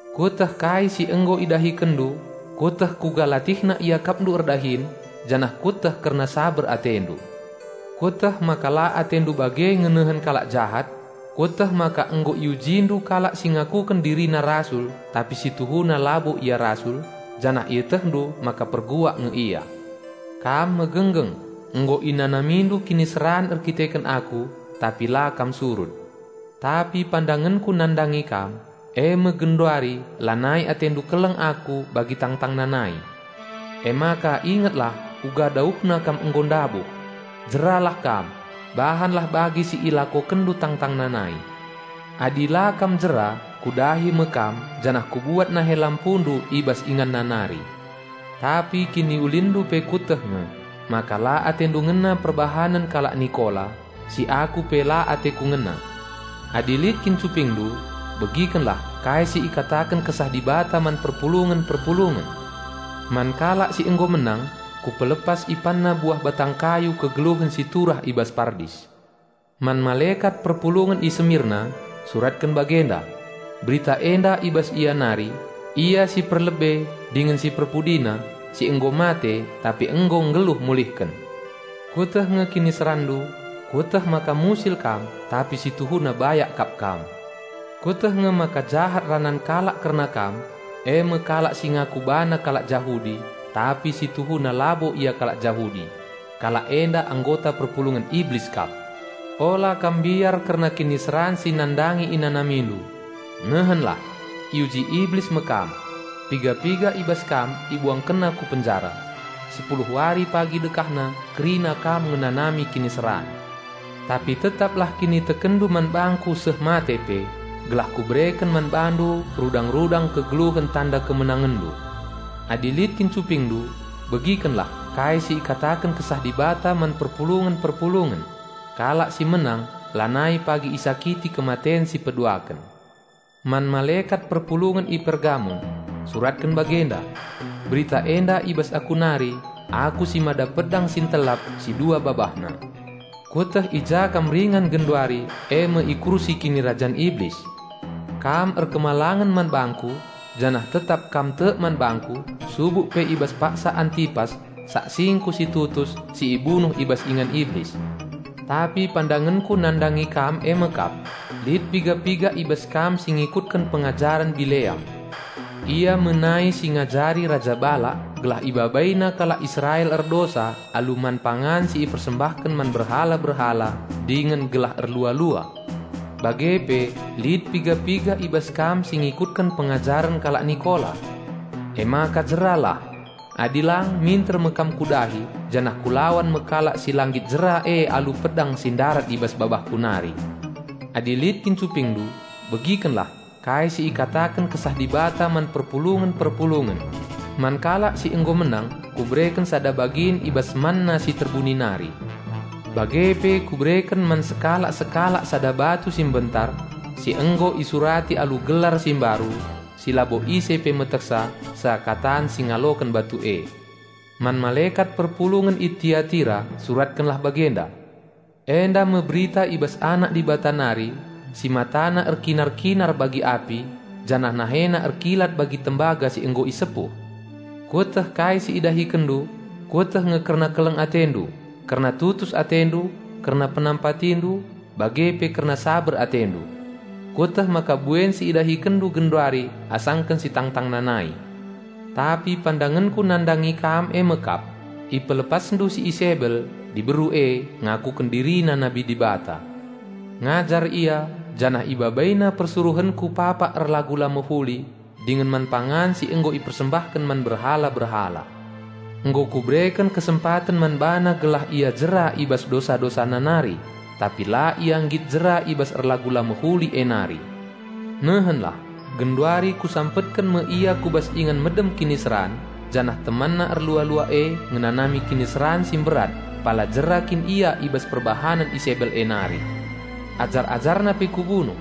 Kueteh kai si nggo idahikenndu; Kueteh kuga latihna iakapndu erdahin, janah Kueteh kerna saber atendu. Kueteh maka la atendu bage ngenehen kalak jahat. Kueteh maka nggo iujindu kalak si ngakuken dirina rasul tapi si tuhuna labo ia rasul, janah ietehndu maka perbual nge ia. Kam megenggeng, nggo inanamindu kiniseran erdandanken Aku, tapi la kam surut. Tapi pandangenKu nandangi kam, e me genduari lanai atendu keleng Aku bagi tangtangna nai. Emaka ingetlah uga dauhna kam nggo ndabuh! Jeralah kam! Bahanlah bagi si ilakokenndu tangtangna nai. Adi la kam jera Kudahi me kam janah Kubuat nahe lampundu i bas inganna nari. Tapi kiniulinndu pe Kueteh nge, maka la atendu ngena perbahanen kalak Nikola, si Aku pe la ateKu ngena. Adi lit kin cupingndu, begikenlah kai si ikataken Kesah Dibata man perpulungen-perpulungen! Man kalak si nggo menang, Kupelepas ipanna buah batang kayu kegeluhen si turah i bas Pardis." "Man malekat perpulungen i Semirna, suratken bagenda: Berita enda i bas Ia nari, Ia si perlebe dingen si perpudina, si nggo mate tapi nggo nggeluh mulihken. Kueteh nge kiniseranndu; Kueteh maka musil kam tapi si tuhuna bayak kap kam! Kueteh nge maka jahat ranan kalak kerna kam, e me kalak si ngaku bana kalak Jahudi, tapi si tuhuna labo ia kalak Jahudi; kalak enda anggota perpulungen Iblis kap! Ula kam mbiar kerna kiniseran si nandangi inanamindu. Nehenlah! Iuji Iblis me kam. Piga-piga i bas kam ibuangkenna ku penjara. Sepuluh wari pagi dekahna kerina kam ngenanami kiniseran. Tapi tetaplah kinitekenndu man bangKu seh mate pe, gelah Kubereken man bandu rudang-rudang kegeluhen tanda kemenangenndu. Adi lit kin cupingndu begikenlah kai si ikataken Kesah Dibata man perpulungen-perpulungen! Kalak si menang lanai pagi isakiti kematen si peduaken." "Man malekat perpulungen i Pergamon, suratken bagenda: Berita enda i bas Aku nari, Ia si lit PedangNa ntelap, dua bobahua. Kueteh i ja kam ringan genduari, e me i kursi kinirajan Iblis. Kam patuh man bangKu, janah tetap kam tek man bangKu, subuk pe i bas paksa Antipas, saksingKu si tutus, si ibunuh i bas ingan Iblis. Tapi pandangenKu nandangi kam e me kap: Lit piga-piga i bas kam si ngikutken pengajaren Bileam. Bileam nai ngajari Raja Bala. Mbabai kalak Israel erdosa alu man pangan si ipersembahken man berhala-berhala dingen erlua-lua. Bage pe lit piga-piga i bas kam si ngikutken pengajaren kalak Nikola. Emaka jeralah! Adi lang minter me kam Kudahi janah Kulawan me kalak si la nggit jera e alu pedang si ndarat i bas babahKu nari. Adi lit kin cupingndu begikenlah kai si ikataken Kesah Dibata man perpulungen-perpulungen! Man kalak si nggo menang Kubereken sada bagin i bas manna si terbuni nari. Bage pe Kubereken man sekalak-sekalak sada batu rintik mbentar, si nggo isurati alu gelar si mbaru, si labo ise pe metehsa, seakatan si ngaloken batu e." "Man malekat perpulungen i Tiatira suratkenlah bagenda: Enda me berita i bas Anak Dibata nari, si MataNa erkinar-kinar bagi api, janah NaheNa erkilat bagi tembaga si nggo isepuh. Kueteh kai si idahikenndu. Kueteh nge kerna keleng atendu, kerna tutus atendu, kerna penampatindu, bage pe kerna saber atendu. Kueteh maka buen si idahikenndu genduari asangken si tangtangna nai. Tapi pandangenKu nandangi kam e me kap: Ipelepasndu si Isebel, diberu e, ngakuken dirina nabi Dibata. Ngajar ia, janah ibabaina persuruhenKu papak erlagu la mehuli, dingen man pangan si nggo ipersembahken man berhala-berhala. Nggo Kubereken kesempaten man bana gelah ia jera i bas dosa-dosana nari, tapi la ia nggit jera i bas erlagu la mehuli e nari. Nehenlah, genduari Kusampetken me ia ku bas ingan medem kiniseran, janah temanna erlua-lua e ngenanami kiniseran si mberat, pala jera kin ia i bas perbahanen Isebel e nari. Ajar-ajarna pe Kubunuh.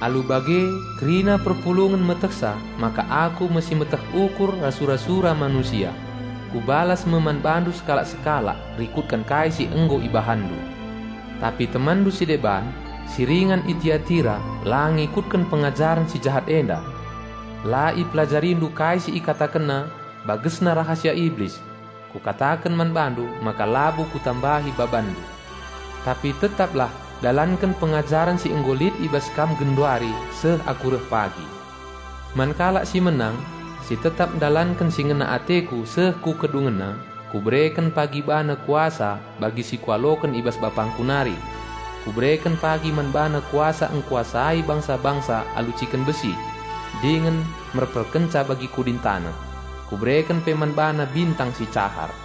Alu bage kerina perpulungen metehsa maka Aku me si meteh ukur ras sura-sura manusia. Kubalas me man bandu sekalak-sekalak rikutken kai si nggo ibahanndu. Tapi temanndu si deban, si ringan i Tiatira la ngikutken pengajaren si jahat enda. La ipelajarindu kai si ikatakenna 'bagesna rahasia Iblis'. Kukataken man bandu maka labo Kutambahi babanndu. Tapi tetaplah dalanken pengajaren si nggo lit i bas kam genduari seh Aku reh pagi. Man kalak si menang, si tetap ndalanken si ngena ateKu seh ku kedungenna, Kubereken pagi bana kuasa bagi si Kualoken i bas BapangKu nari. Kubereken pagi man bana kuasa ngkuasai bangsa-bangsa alu ciken besi, dingen ngeripukkenca bagi kudin taneh. Kubereken pe man bana bintang si cahar.